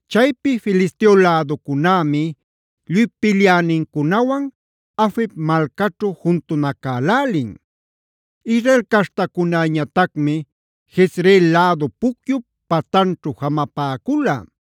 Chaypi Filisteo läducunämi lluy pilyänincunawan Afec malcaćhu juntunacälälin. Israel caśhtacunäñatacmi Jezreel lädu pucyup patanćhu jamapäcula.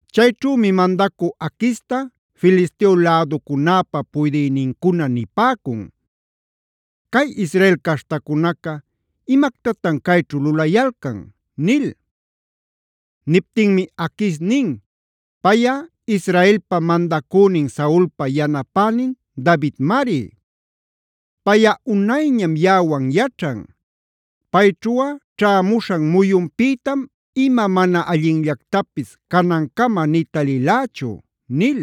Chayćhümi mandacü Aquista Filisteo läducunäpa puydïnincuna nipäcun: “¿Cay Israel caśhtacunaca imactatan cayćhu lulayalcan?” nil. Niptinmi Aquis nin: “Payꞌa Israelpa mandacünin Saulpa yanapänin Davidmari. Payꞌa unayñam yaꞌawan yaćhan. Payćhuꞌa ćhämuśhan muyunpïtam ima mana allinllactapis canancama nï talilächu” nil.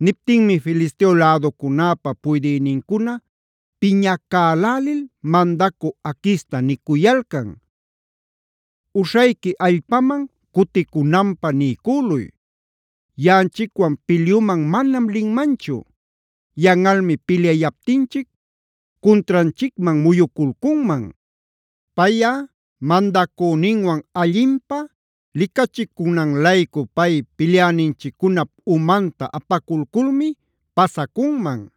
Niptinmi Filisteo läducunäpä puydïnincuna piñacälälil mandacü Aquista nicuyalcan: “Uśhayqui allpaman cuticunanpä niycüluy. Yaꞌanchicwan pilyuman manam linmanchu. Yanꞌalmi pilyayaptinchic cuntranchicman muyuculcunman. Payꞌa mandacüninwan allinpä licachicunan-laycu cay pilyäninchiccunap umanta apaculculmi pasacunman.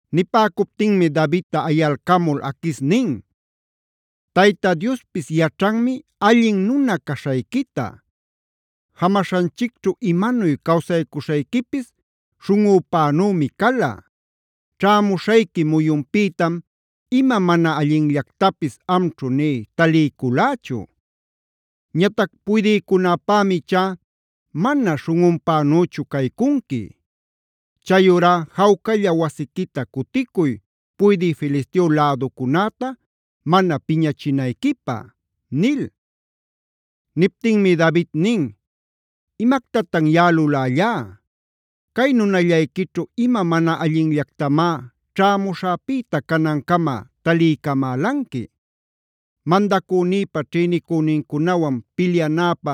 Nipäcuptinmi Davidta ayalcamul Aquis nin: “Tayta Diospis yaćhanmi allin nuna caśhayquita. Jamaśhanchicćhu imanuy cawsaycuśhayquipis śhunꞌüpänümi cala. Ćhämuśhayqui muyunpïtam ima mana allinllactapis amćhu nï taliyculächu. Ñatac puydïcunäpämi ichá mana śhunꞌunpänüchu caycunqui. Chayurá jawcalla wasiquita cuticuy puydï Filisteo läducunäta mana piñachinayquipä” nil. Niptinmi David nin: “¿Imactatan yaꞌa lulällá? Cay nunallayquićhu ¿ima mana allinllactamá ćhämuśhäpïta canancama taliycamälanqui? Mandacünïpa ćhïnicünincunawan pilyanäpä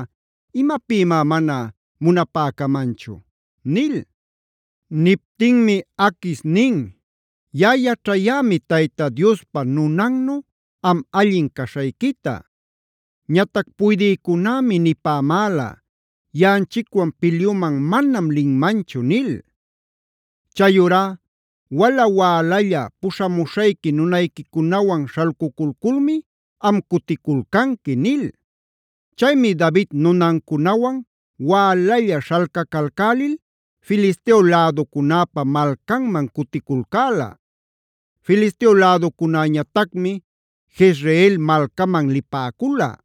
¿imapïmá mana munapäcamanchu?” nil. Niptinmi Aquis nin: “Yaꞌa yaćhämi Tayta Diospa nunannu am allin caśhayquita. Ñatac puydïcunämi nipämäla: ‘Yaꞌanchicwan pilyuman manam linmanchu’ nil. Chayurá wala-wälalla puśhamuśhayqui nunayquicunawan śhalcuculculmi am cuticulcanqui” nil. Chaymi David nunancunawan wälalla śhalcacalcälil Filisteo läducunäpa malcanman cuticulcäla. Filisteo läducunäñatacmi Jezreel malcaman lipäcula.